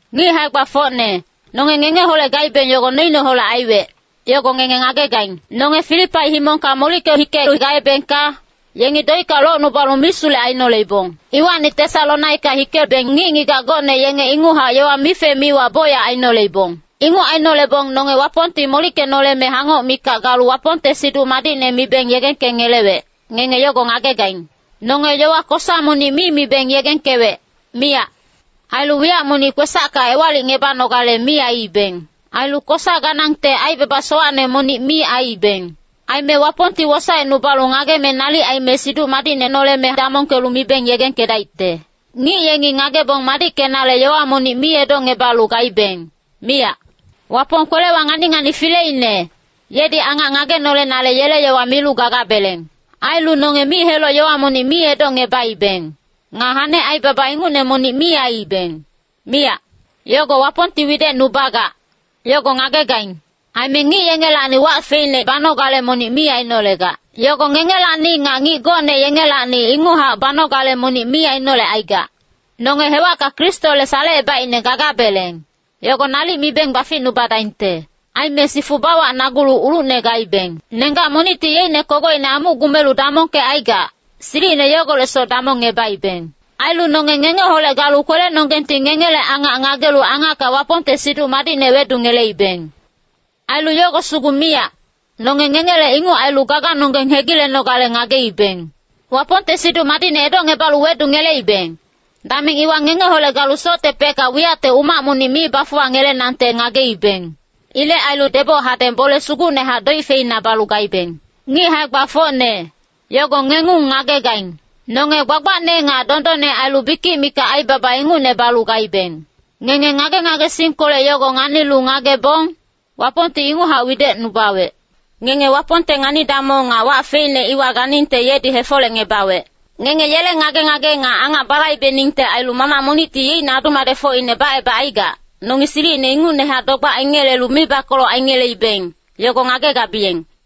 Ngic hae-gbafocne, nonge ngengeholec gaibeng, yogo noineholec aiwec, yogo ngenge ngagegaing. Nonge Filipai himongka molicke hikelu gaebengka, yengi doicka locnubalu misulec ainoleibong. Iwacni Tesalonika hikebeng ngic-ngigac gocne yengi inguchac yowa mife-miwa bocyac ainoleibong. Inguc ainolebong nonge Wapongti molickenoleme hangoc mikac galu Wapongte Siduc Madicne mibeng yegengkengelewec, ngenge yogo ngagegaing. Nonge yowa kosa monic mi mibeng yegengkewec, miyac. Ailu wiyac monic kwesacka ewalicngebanogale mi aiibeng. Ailu kosa ganangte aibaba sowacne monic mi aiibeng. Aime Wapongti wosaecnubalu ngageme nalic aime Siduc Madicne noleme damongkelu mibeng yegengkedaicte. Ngic yengi ngagebong madickenale yowa monic mi edocngebalu gaibeng, miyac. Wapong kwelewa ngani-ngani fileine, yedi angac ngagenolenale yele yowa milu gagabeleng. Ailu nonge mic-heloc yowa monic mi edocngebaibeng. Nga hane aibaba ingucne monic mi aiibeng, miyac. Yogo Wapongti widecnubagac, yogo ngagegaing. Aime ngic yengelacni wac feicne banogale monic mi ainolegac. Yogo ngengelacni nga ngic gocne yengelacni inguchac banogale monic mi ainolecaigac. Nonge hewacka Kristole salecebaicne gagabeleng, yogo nalic mibeng baficnubadaingte. Aime sifu bawacnagulu ulucne gaibeng. Nenggac monicti yeicne kogocine amuc gumelu damongkecaigac, silicine yogolecsoc damongngebaibeng. Ailu nonge ngengeholec galu kwelenonggengti ngengele angac ngagelu angacka Wapongte Siduc Madicne wedungeleibeng. Ailu yogo sugu miyac, nonge ngengele inguc ailu gaganonggeng hegilenogale ngageibeng. Wapongte Siduc Madicne edocngebalu wedungeleibeng, dameng iwa ngengeholec galu soctepecka wiyacte umac monic mi bafuwangelenangte ngageibeng. Ilec ailu deboc hadeng bole sugucnehac doic feina balu gaibeng. Ngic hae-gbafocne, yogo ngengung ngagegaing. Nonge gbagbacne nga dondonne ailu bikic mikac aibaba ingucne balu gaibeng. Ngenge ngage-ngagesingkolec yogo nganilu ngagebong, Wapongti inguchac widecnubawec. Ngenge Wapongte ngani-damong nga wac feicne iwa ganingte yedi hefolecngebawec. Ngenge yele ngage-ngage nga angac balaibeningte ailu mamac monicti yeicne adu-madecfocine bacebacaigac, nongi silicine ingucnehac dogbac aingelelu mibakoloc aingeleibeng, yogo ngagegabiyeng.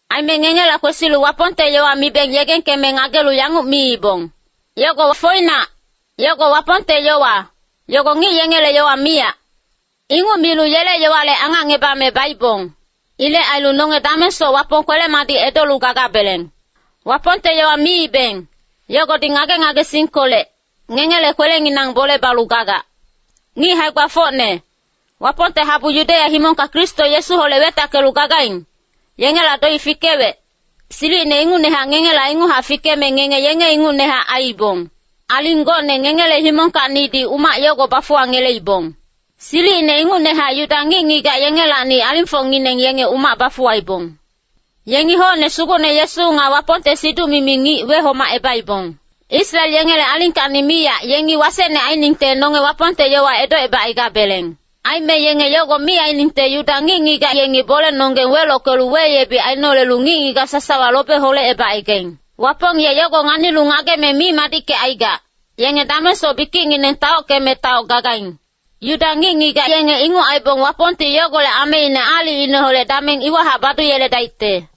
Aime ngengela kwesilu Wapongte yowa mibeng yegengkeme ngagelu yanguc miibong, “Yogo foinac, yogo Wapongte yowa, yogo ngic yengele yowa miyac.” Inguc milu yele yowale angacngebame baibong. Ilec ailu nonge damengsoc Wapong kwele-madic edolu gagabeleng. Wapongte yowa miibeng, yogodi ngage-ngagesingkolec, ngengele kwelenginang bole balu gagac. Ngic hae-gbafocne, Wapongte habu Yudeya himongka Kristo Yesuholec wetackelu gagaing, yengela doic fikewec, silicine ingucnehac ngengela inguchac fikeme, ngenge yenge ingucnehac aiibong. Aling gocne ngengele himongkacnidi umac yogo bafuwangeleibong. Silicine ingucnehac Yuda ngic-ngigac yengelacni alingfocngineng yenge umac bafuwaibong. Yengi hocne Sugucne Yesu nga Wapongte siduc-mimi ngic wehomacebaibong. Israel yengele alingkacni miyac yengi wasecne ainingte nonge Wapongte yowa edocebacaigabeleng. Aime yenge yogo mi ainingte Yuda ngic-ngigac yengi bolenonggeng welockelu weyebic ainolelu ngic-ngigac sasawa lobe holecebacaigaing. Wapong ye yogo nganilu ngageme mi madickecaigac, yenge damengsoc bikicngineng taockeme taoc gagaing. Yuda ngic-ngigac yenge inguc aibong Wapongti yogolec ameine aalicineholec dameng iwahac baduyeledaicte.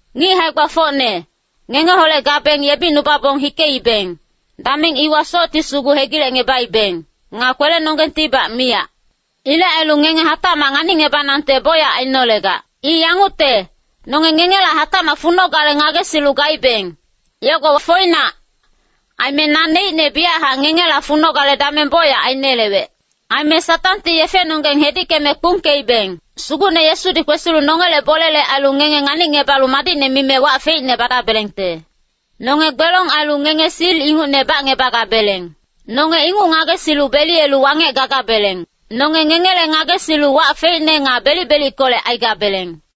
Ngic hae-gbafocne, ngengeholec gabeng yebicnubabong hikeibeng, dameng iwa socti sugu hegilecngebaibeng. Nga kwelenonggengtibac miyac. Ilec ailu ngenge hatacmac nganicngebanangte bocyac ainolegac. I yangucte, nonge ngengela hatacmac funogale ngagesilu gaibeng, yogo foinac. Aime naneicne biyachac ngengela funogale dameng bocyac ainelewec. Aime Satangti yefenonggeng hedickeme kpungkeibeng. Sugucne Yesudi kwesilu nongele bolele ailu ngenge nganicngebalu madicne mime wac feicne badabelengte. Nonge gbelong ailu ngenge sil ingucne bacngebagabeleng. Nonge inguc ngagesilu beliyelu wangec gagabeleng. Nonge ngengele ngagesilu wac feicne nga belic-belickolec aigabeleng.